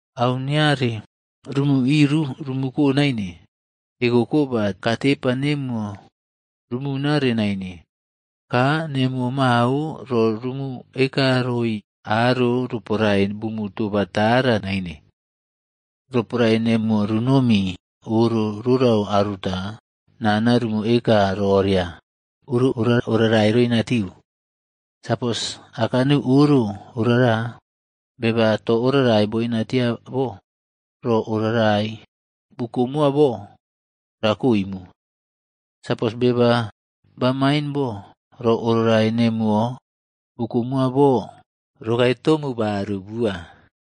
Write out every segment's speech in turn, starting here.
Au niare rumuꞌiru rumuko naine, ekoko ba katepa nemuwo rumunare naine, ka nemuwo mao ro rumu ekaroi aro roporae bumu toba tara naine. “Roporae nemuwo runomi oro rorau aruta, nana rumu eka roria, ‘Oro ora oꞌrarai roinatiu.’ Sapos aka neu oro orara beba to oꞌrarai boina tia bo, ro oꞌrarai bukomoa bo rakoimu. Sapos beba bamain bo, ro oꞌrarai nemuwo bukomowa bo rokae tomu baru bua.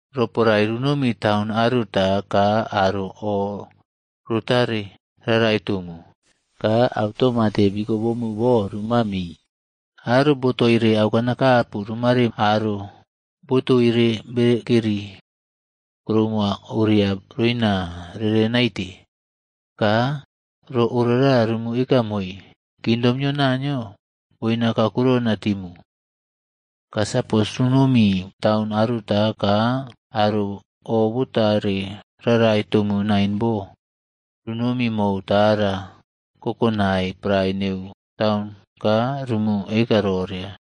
“Roporae runomi taun aruta ka aro o rotare rarai tomu, ka automate bikobomu bo ruma mii. Aro botoire aukanakapu rumaare aro botoire bekeri kuroumo oria roina rere naite, ka ro orara rumu eka moii, ‘Kingdom nio Naniyo boina kakurouna timu.’ Ka sapos runomi taun aruta ka aro obotare rarai tomu naine bo, runomi mou tara kokonae pare neu taun ka rumu eka roria,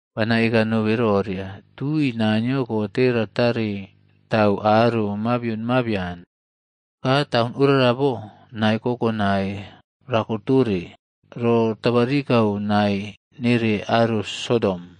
Bana eka nobe roria, tui Naniyo kote ratare tau aro mabion mabian, ka taun orara bo nae kokonai rakotore ro tabarikau nae nere aro Sodom.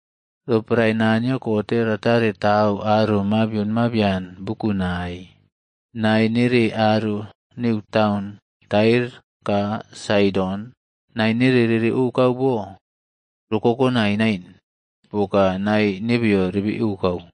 Roporae Naniyo kote ratare tau aro mabion mabian bukunai, nae nere aro neu taun Tair ka Saidon nae nere rere okau bo ro kokonai nain poka nae nebeyo rebeko.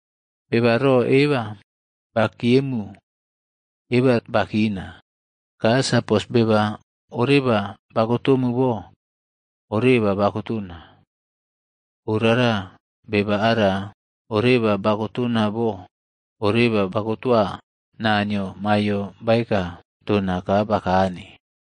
“Beba ro eba bakiyemu, eba bakina, ka sapos beba oreba bakotomu bo, oreba bakotona. Orara, beba ara oreba bakotona bo, oreba bakotoa Naniyo maiyo baeka tona ka bakane.”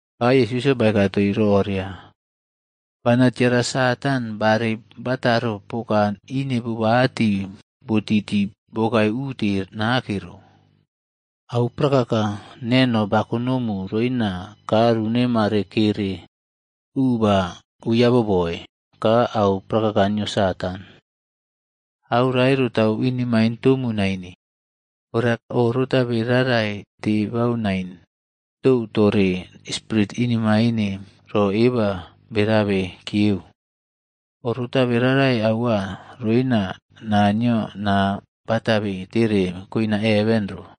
Ka Yesusꞌyo baeka toii roria, “Bana tiara Satand barei bataro poka ineꞌbobati botiti bokae ute nake ro. Au prakaka neno baꞌkonomu roina kaa runema kere u ba ui aboboe ka au prakaka nio Satan. Au rae rotau inemaine tomu naine. Ora oꞌrotabe rarai tebau nain tou tore spirit inemaine ro eba berabe kiyeu, o rotabe rarai aua roria Naniyo naa batabe tere koina heven ro.”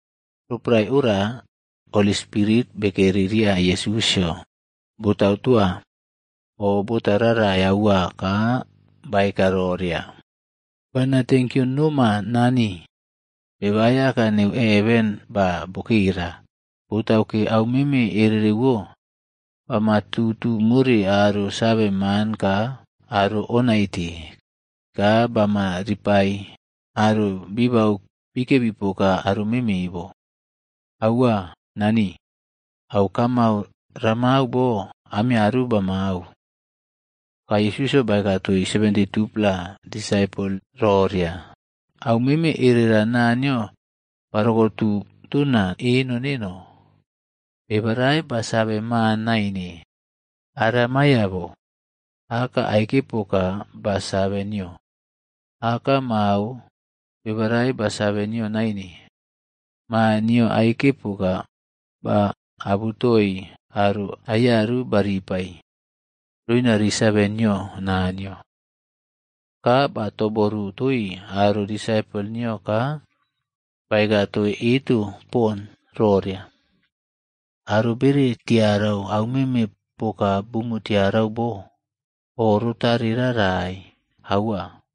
Roporae ora Holi Spirite bekeri ria Yesusꞌyo botau toa o bota rarai aua ka baeka roria, “Bana tenkyo noma Nani, Beba Aiyaka neu heven ba bokera. Botauke au meme erereꞌwo bama tutu more aro save man ka aro o naite, ka bama ripai aro bibau bikebi poka aro meme bo. Aua, Nani, au kamau ramau bo amiaru bamau.” Ka Yesusꞌyo baeka toii 72-pla disaipol roria, “Aumeme erera Naniyo barokotu tona eno neno. Beba rae ba save Maa naine, ara maiyo bo. Aka aike poka ba save nio. Aka mao, beba rae ba save nio naine. Maa nio aike poka baꞌabutoi aro aiyaru baripai, roina ri save nio Naniyo.” Ka ba toboru toii aro disaipol nio ka baeka toii eto pon roria, “Aro bere tiarau aumeme poka bumu tiarau bo, o rotare rarai aua.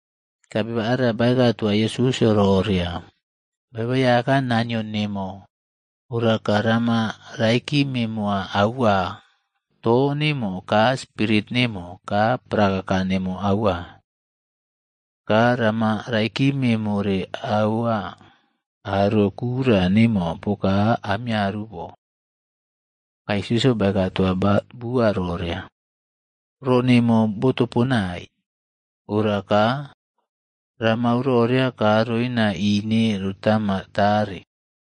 Ka beba ara baeka toa Yesusꞌyo roria, “ ‘Beba Aiyaka Naniyo nemo, ora ka rama raikime moa aua to nemo ka spirit nemo ka prakaka nemo aua. Ka rama raikime more aua aro kura nemo poka amiaru bo.’” Ka Yesusꞌyo baeka toa bua roria, “Ro nemo botoponai. Ora ka, ramau roria ka roina ine rotama tare.”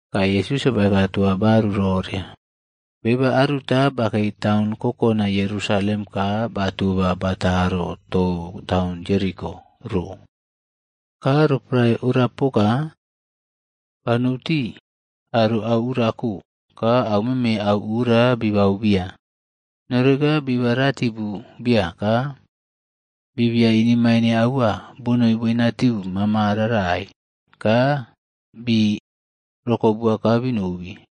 Ka Yesusꞌyo baeka toa bua roria, “Beba aruta bakei taun kokonai Yerusalem ka batoba bataro tou taun Jeriko ro, ka roporae ora poka, ba nou tii aro au uraꞌko ka aumeme auura bii baubia, noreka biba ratibu biya ka bibia inemaine aua bonoi boinatiu mama rarai ka bii rokobua ka binobi.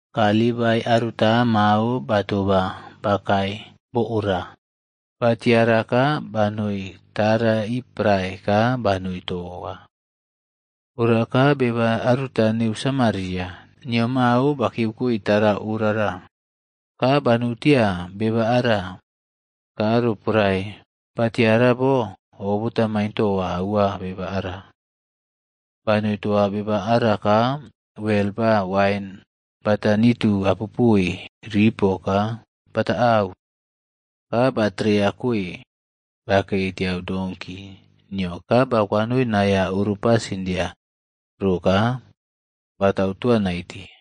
“Ka Livaii aruta mao batoba bakae bo ora, batiara ka banoi tara ii prae ka banoi toa. Ora ka beba aruta neu Samariaj nio mao bakiyeu koi tara orara, ka banou tia beba ara. Ka roporae batiara bo, o botamain toa aua beba ara. Banoi toa beba ara ka wel ba wain bata nitu apopoe ripo ka bata auu. Ka batereya koe bakei tiau donkik nio ka ba kwanoi naiya oro pasindia ro ka batau toa naite.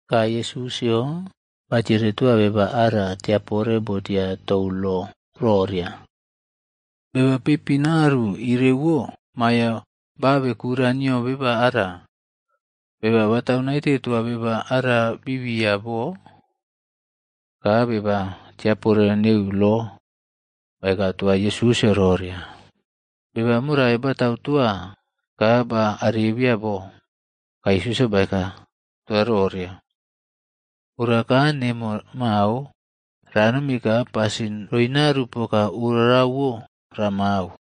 Ka Yesusꞌyo batiere toa beba ara tiapore botia tou lo roria, “Beba peipinꞌaru irewo maiyo baꞌabe kura nio beba ara, beba batau naite toa beba ara biꞌbiya bo?” Ka beba tiapore neu lo baeka toa Yesusꞌyo roria, “Beba morai batau toa ka ba arebia bo.” Ka Yesusꞌyo baeka toa roria, “Ora ka nemo mao ranomi ka pasin roinaru poka orawo ramau.”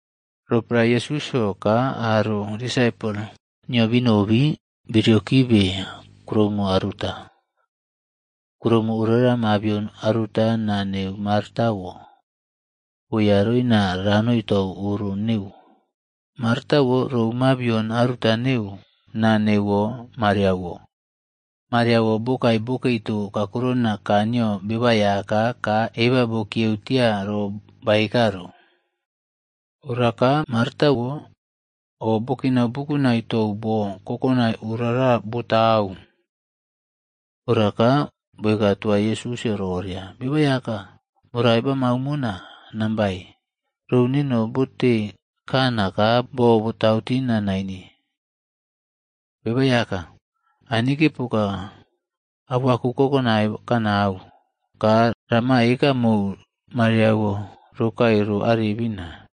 Roporae Yesusꞌyo ka aro disaipol nio binobi, biriokibe kuroumo aruta. Kuroumo orara mabion aruta naa neuwo Martaꞌwo boeya roina ranoi tou oro neu. Martaꞌwo rou mabion aruta neu naa neuwo Mariaꞌwo. Mariaꞌwo bokae bokei to kakurona kaa nio Beba Aiyaka ka eba bokiyeu tia ro baeka ro. Ora ka Martaꞌwo o bokinau bukunai tou bo kokonai orara botau. Ora ka bokae toa Yesusꞌyo roria, “Beba Aiyaka, morai bamau mona nambae? Rou neno bote kana ka bo botau tina naine. Beba Aiyaka, anike poka auaku kokonai kanau, ka rama eka mou Mariaꞌwo rokae ro arebina.”